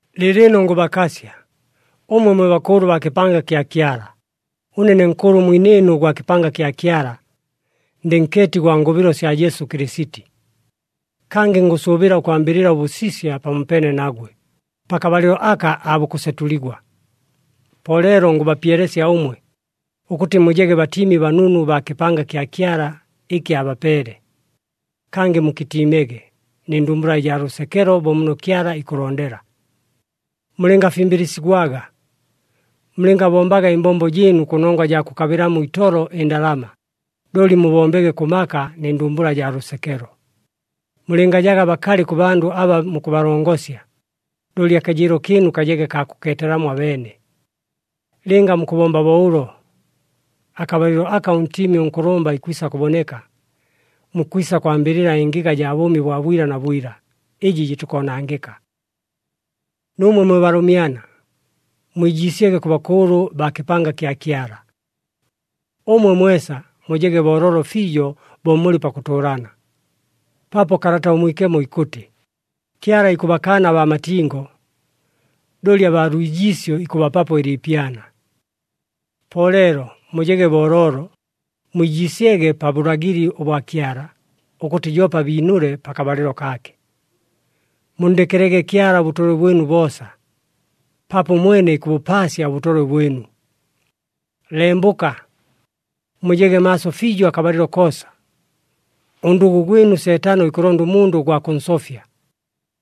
Lɨɨlɨno ngʉbakasya, ʉmwe mwe bakʉʉlʉ baa kɨpanga kya Kyala. Ʉne ne nkʉʉlʉ mwinɨɨnu gwa kɨpanga kya Kyala. Ndɨ nkeeti gwa ngʉbɨlo sya Jesu Kɨlɨsiti. Kangɨ ngʉsʉʉbɨla ʉkwambɨlɨla ʉbʉsisya pamopeene nagwe, pakabalɨlo aka aabukʉsetʉligwa. Po leelo ngʉbapyelesya ʉmwe, ʉkʉtɨ mujege batiimi banunu baa kɨpanga kya Kyala, ɨkɨ abapeele. Kangɨ mukɨtiimege nɨ ndumbula ɨjaa lʉsekelo bo muno Kyala ikʉlondela. Mulɨngafimbɨlɨsigwaga. Mulɨngabombaga ɨmbombo jɨɨnu kʉnongwa jaa kʉkabɨlamo itolo ɨndalama, looli mubombege kʉ maka nɨ ndumbula jaa lʉsekelo. Mulɨngajaga bakalɨ kʉ bandʉ aba mukʉbalongosya, looli akajɨɨlo kɨɨnu kajege kaa kʉkeetelamo abeene. Lɨnga mukʉbomba bo ʉlo, akabalɨlo aka ʉNtiimi ʉNkʉlʉmba ikwisa kʉboneka, mukwisa kwambɨlɨla ɨngɨga jaa bʉʉmi bwa bwila na bwila, ɨjɨ jɨtikoonangɨka. Nuumwe mwe balʉmyana, mwijiisyege kʉ bakʉʉlʉ baa kɨpanga kya Kyala. Ʉmwe mwesa mujege booloolo fiijo bo mulɨ pakʉtʉʉlana, paapo Kalata ʉMwikemo ikʉtɨ, “Kyala ikʉbakaana abaa matingo, looli abaa lwijiisyo ikʉbapapo ɨliipyana.” Po leelo mujege booloolo, mwijiisyege pa bʉlagɨli ʉbwa Kyala, ʉkʉtɨ joope abiinʉle pakabalɨlo kaake. Munndekelege Kyala ʉbʉtolwe bwɨnu boosa, paapo ʉmwene ikʉbʉpaasya ʉbʉtolwe bwɨnu. Lembʉka! Mujege maaso fiijo akabalɨlo koosa. Ʉndʉgʉ gwɨnu Seetano ikʉlonda ʉmundʉ gwa kʉnsofya,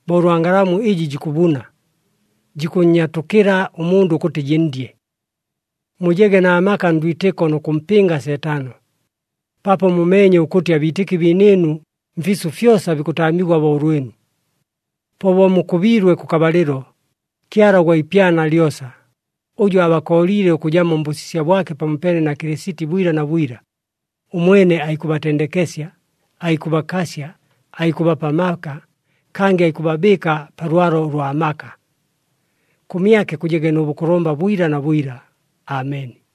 bo ʉlwa ngalamu ɨjɨ jikʉbuna, jikʉnnyatʉkɨla ʉmundʉ ʉkʉtɨ jɨnndye. Mujege na maka ndwitɨko nʉ kʉmpɨnga Seetano, paapo mumeenye ʉkʉtɨ abiitɨki biinɨɨnu mfiisʉ fyosa bikʉtaamigwa bo ʉlwɨnu. Po bo mukʉbiilwe kʉkabalɨlo, Kyala ʉgwa ipyana lyosa, ʉjʉ aabakooliile ʉkʉjamo mbʉsisya bwake pamopeene na Kɨlɨsiti bwila na bwila, ʉmwene aikʉbatendekesya, aikʉbakasya, aikʉbapa amaka, kangɨ aikʉbabɨɨka pa lwalo ʉlwa maka. Kʉmyake kʉjege nʉ bʉkʉlʉmba bwila na bwila! Ameni.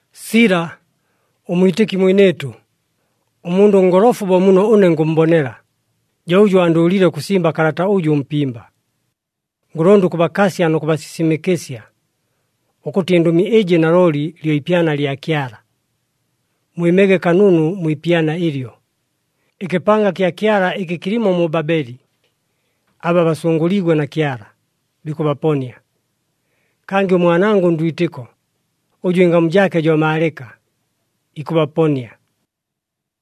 Sila, ʉmwitɨki mwinɨɨtʉ, ʉmundʉ ʉngolofu bo muno ʉne ngʉmmbonela, jo ʉjʉ andʉʉlile ʉkʉsimba kalata ʉjʉ ʉmpimba. Ngʉlonda ʉkʉbakasya nʉ kʉbasisimɨkɨsya, ʉkʉtɨ ɨndʉmi ɨjɨ nalooli lyo ipyana lya Kyala. Mwɨmege kanunu mwi ipyana ɨlyo. Ɨkɨpanga kya Kyala ɨkɨ kɨlimo mu Babeli, aba basʉngʉliigwe na Kyala, bikʉbaponia. Kangɨ ʉmwanangʉ ndwitɨko, ʉjʉ ɨngamu jaake jo Maalɨka, ikʉbaponia.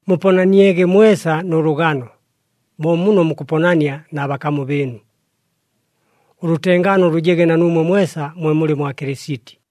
Muponaniege mwesa nʉ lʉgano, bo muno mukʉponania na bakamu bɨɨnu. Ʉlʉtengaano lʉjege na nuumwe mwesa mwe mulɨ mwa Kɨlɨsiti.